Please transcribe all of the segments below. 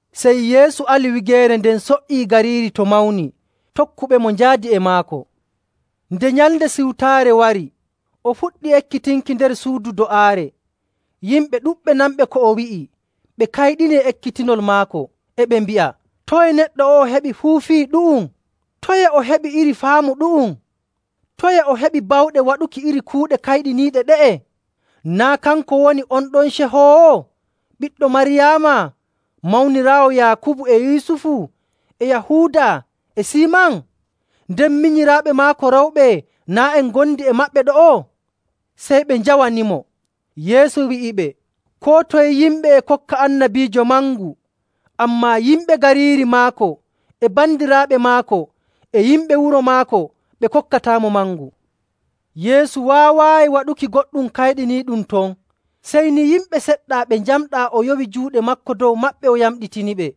Sey Yeesu ali wigeere nden so''ii gariiri to mawni, tokkuɓemo njaadi e maako. Nde Nyalnde Siwtaare wari, o fuɗɗi ekkitinki nder suudu do'aare. Yimɓe ɗuɗɓe nanɓe ko o wi'i, ɓe kayɗini e ekkitinol maako. E ɓe mbi'a, “Toye neɗɗo o'o heɓi fuu fii ɗu'um? Toye o heɓi iri faamu ɗu'um? Toye o heɓi bawɗe waɗuki iri kuuɗe kayɗiniiɗe ɗe'e? Naa' kanko woni on ɗon cehoowo, ɓiɗɗo Maryaama, mawniraawo Yaakubu, e Yusufu, e Yahuuda, e Siiman? Nden minyiraaɓe maako rewɓe naa' en ngondi e maɓɓe ɗo'o?” Sey ɓe njawanimo. Yeesu wi'iɓe, “Koo toye yimɓe e kokka annabiijo mangu, ammaa yimɓe gariiri maako, e bandiraaɓe maako, e yimɓe wuro maako, ɓe kokkataamo mangu.”. Yeesu waawaayi waɗuki goɗɗum kayɗiniiɗum ton, sey ni yimɓe seɗɗa ɓe njamɗaa o yowi juuɗe maako dow maɓɓe o yamɗitiniɓe.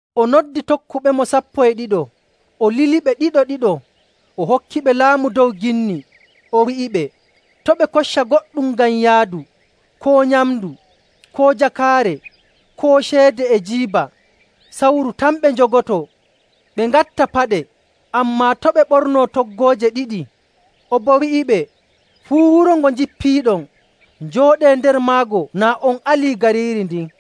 O noddi tokkuɓemo sappo e ɗiɗo, o liliɓe ɗiɗo‑ɗiɗo, o hokkiɓe laamu dow ginni. O wi'iɓe to' ɓe kocca goɗɗum ngam yaadu, koo nyamndu, koo jakaare, koo ceede e jiiba. Sawru tan ɓe njogotoo. Ɓe ngatta paɗe, ammaa to' ɓe ɓornoo toggooje ɗiɗi. O boo wi'iɓe, “Fuu wuro ngo njippiiɗon, njooɗee nder maago naa on alii gariiri ndin.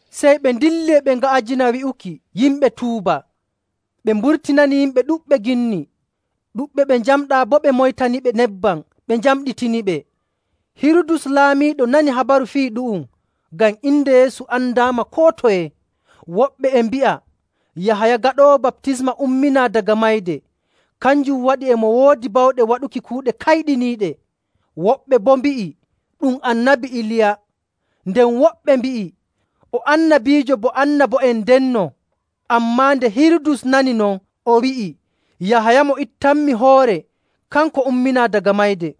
Sey ɓe ndilli e ɓe nga'ajina wi'uki yimɓe tuuba. Ɓe mburtinani yimɓe ɗuɗɓe ginni, ɗuɗɓe ɓe njamɗaa boo ɓe moytaniɓe nebbam ɓe njamɗitiniɓe.. Hirudus Laamiiɗo nani habaru fii ɗu'um, ngam inde Yeesu andaama koo toye. Woɓɓe e mbi'a Yahaya Gaɗoowo Baptisma umminaa daga mayde, kanjum waɗi e mo woodi bawɗe waɗuki kuuɗe kayɗiniiɗe. Woɓɓe boo mbi'i, “Ɗum Annabi Iliya.” Nden woɓɓe mbi'i, “O annabiijo bo annabo'en ndenno.”. Ammaa nde Hirudus nani non, o wi'i, “Yahaya mo ittanmi hoore, kanko umminaa daga mayde!”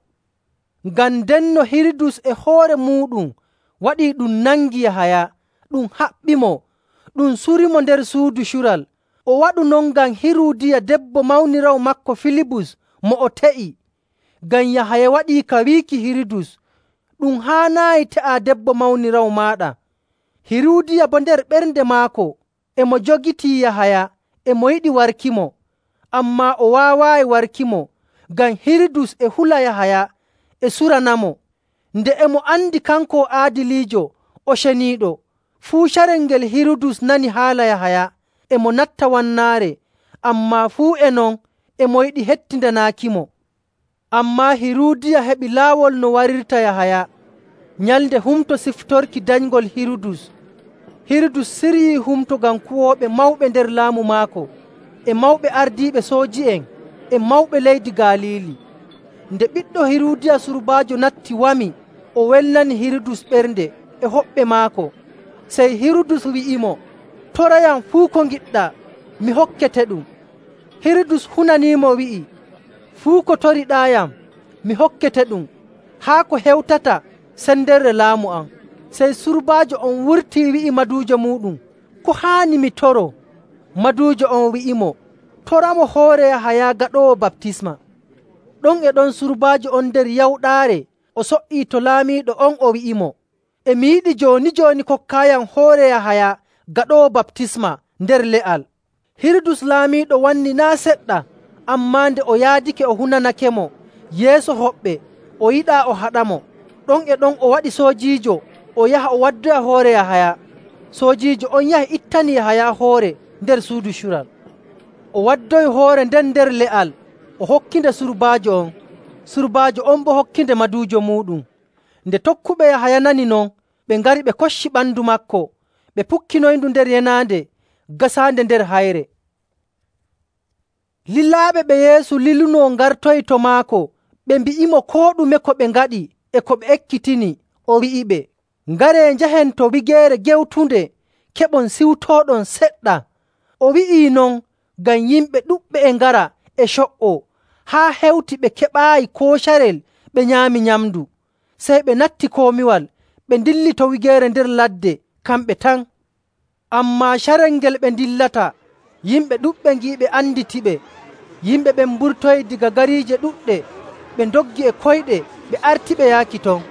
Ngam ndenno Hirudus e hoore muuɗum waɗii ɗum nangii Yahaya, ɗum haɓɓimo, ɗum surimo nder suudu cural. O waɗu non ngam Hiruudiya debbo mawniraawo maako Filibus mo o te'i. Ngam Yahaya waɗii ka wiiki Hirudus, “Ɗum haanaayi te'aa debbo mawniraawo maaɗa.”. Hiruudiya boo nder ɓernde maako e mo jogitii Yahaya e mo yiɗi warkimo. Ammaa o waawaayi warkimo, ngam Hirudus e hula Yahaya e suranamo, nde e mo andi kanko o aadiliijo o ceniiɗo. Fuu carel ngel Hirudus nani haala Yahaya, e mo natta wannaare. Ammaa fuu e non e mo yiɗi hettindanaakimo. Ammaa Hiruudiya heɓi laawol no warirta Yahaya. Nyalnde humto siftorki danyngol Hirudus, Hirudus siryii humto ngam kuwooɓe mawɓe nder laamu maako, e mawɓe ardiiɓe sooji'en, e mawɓe leydi Galiili. Nde ɓiɗɗo Hiruudiya surbaajo natti wami, o welnani Hirudus ɓernde e hoɓɓe maako. Sey Hirudus wi'imo, “Torayam fuu ko ngiɗɗaa, mi hokketeɗum.” Hirudus hunaniimo wi'i, “Fuu ko toriɗaayam mi hokketeɗum haa ko hewtata sendere laamu am.” Sey surbaajo on wurtii wi'i maduujo muuɗum, “Ko haani mi toroo?” Maduujo on wi'imo, “Toramo hoore Yahaya Gaɗoowo Baptisma.” Ɗon e ɗon surbaajo on nder yawɗaare o so''ii to laamiiɗo on o wi'imo, “E mi yiɗi jooni‑jooni kokkaayam hoore Yahaya Gaɗoowo Baptisma nder le'al.” Hirudus Laamiiɗo wannii naa' seɗɗa, ammaa nde o yaadake o hunanakemo yeeso hoɓɓe, o yiɗaa o haɗamo. Ɗon e ɗon o waɗi soojiijo o yaha o waddoya hoore Yahaya. Soojiijo on yahi ittani Yahaya hoore nder suudu cural, o waddoyi hoore nden nder le'al, o hokkinde surbaajo on. Surbaajo on boo hokkinde maduujo muuɗum. Nde tokkuɓe Yahaya nani non ɓe ngari ɓe kocci ɓandu maako ɓe pukkinoyindu nder yenaande gasaande nder hayre. Lilaaɓe ɓe Yeesu lilunoo ngartoyii to maako, ɓe mbi'imo koo ɗume ko ɓe ngaɗi e ko ɓe ekkitini. O wi'iɓe, “Ngaree, njahen to wigeere gewtunde keɓon ciwtooɗon seɗɗa.” O wi'ii non ngam yimɓe ɗuɗɓe e ngara e co''oo haa hewti ɓe keɓaayi koo carel ɓe nyaami nyamndu. Sey ɓe natti komiwal ɓe ndilli to wigeere nder ladde kamɓe tan. Ammaa carel ngel ɓe ndillata yimɓe ɗuɗɓe ngi'iɓe anditiɓe. Yimɓe ɓen mburtoyii daga gariije ɗuɗɗe ɓe ndoggi e koyɗe ɓe artiɓe yaaki ton.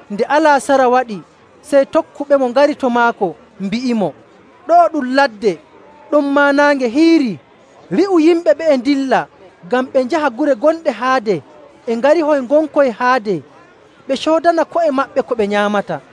Nde alaasara waɗi, sey tokkuɓemo ngari to maako mbi'imo, “Ɗo'o ɗum ladde, ɗonmaa naange hiirii. Wi'u yimɓe ɓe'e ndilla ngam ɓe njaha gure gonɗe haade e ngarihoy ngonkoy haade ɓe coodana ko'e maɓɓe ko ɓe nyaamata.”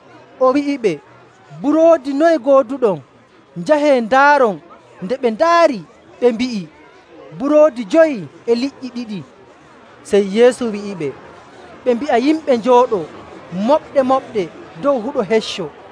O wi'iɓe, “Buroodi noye ngooduɗon? Njahee ndaaron.” Nde ɓe ndaari, ɓe mbi'i, “Buroodi jowi e liƴƴi ɗiɗi.” Sey Yeesu wi'iɓe ɓe mbi'a yimɓe njooɗoo moɓɗe‑moɓɗe dow huɗo hecco.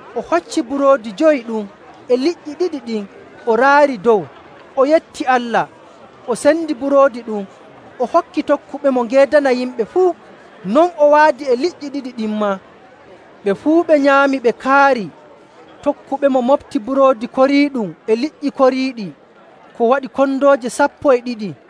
O hocci buroodi jowi ɗum e liƴƴi ɗiɗi ɗin, o raari dow, o yetti Allah, o sendi buroodi ɗum o hokki tokkuɓemo ngeedana yimɓe fuu. Non o waadi e liƴƴi ɗiɗi ɗin maa. Ɓe fuu ɓe nyaami ɓe kaari. Tokkuɓemo moɓti buroodi koriiɗum e liƴƴi koriiɗi ko waɗi kondooje sappo e ɗiɗi.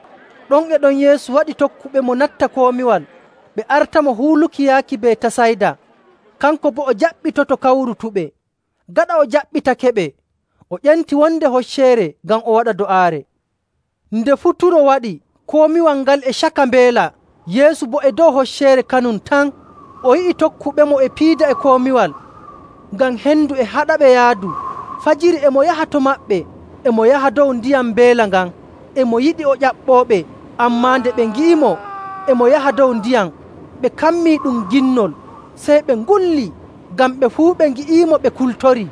Ɗon e ɗon Yeesu waɗi tokkuɓemo natta komiwal ɓe artamo huuluki yaaki Betasayda, kanko boo o jaɓɓitoto kawrutuɓe. Gaɗa o jaɓɓitakeɓe o ƴenti wonde hocceere ngam o waɗa do'aare. Nde futuro waɗi, komiwal ngal e caka mbeela, Yeesu boo e dow hocceere kanum tan. O yi'i tokkuɓemo e piida e komiwal, ngam hendu e haɗaɓe yaadu. Fajiri e mo yaha to maɓɓe, e mo yaha dow ndiyam mbeela ngan. E mo yiɗi o ƴaɓɓooɓe, ammaa nde ɓe ngi'imo e mo yaha dow ndiyam, ɓe kammi ɗum ginnol, sey ɓe ngulli, ngam ɓe fuu ɓe ngi'iimo ɓe kultorii.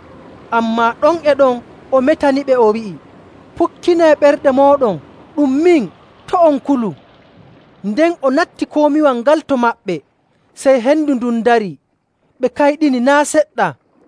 Ammaa ɗon e ɗon o metaniɓe, o wi'i, “Pukkinee ɓerɗe mooɗon, ɗum min. To' on kulu.” Nden o natti komiwal ngal to maɓɓe, sey hendu ndun darii. Ɓe kayɗini naa' seɗɗa,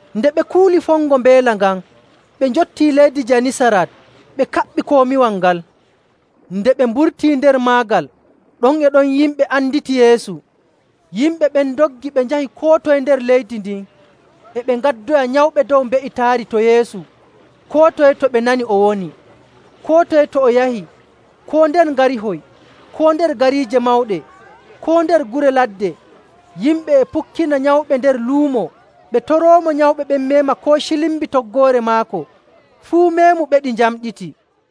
Nde ɓe kuuli fongo mbeela ngan, ɓe njottii leydi Janisarat ɓe kaɓɓi komiwal ngal. Nde ɓe mburtii nder maagal, ɗon e ɗon yimɓe anditi Yeesu. Yimɓe ɓen ndoggi ɓe njahi koo toye nder leydi ndin, e ɓe ngaddoya nyawɓe dow mbe''itaari to Yeesu koo toye to ɓe nani o woni. Koo toye to o yahi, koo nder ngarihoy, koo nder gariije mawɗe, koo nder gure ladde, yimɓe e pukkina nyawɓe nder luumo, ɓe toroomo nyawɓe ɓen meema koo cilmbi toggoore maako. Fuu meemuɓeɗi njamɗiti.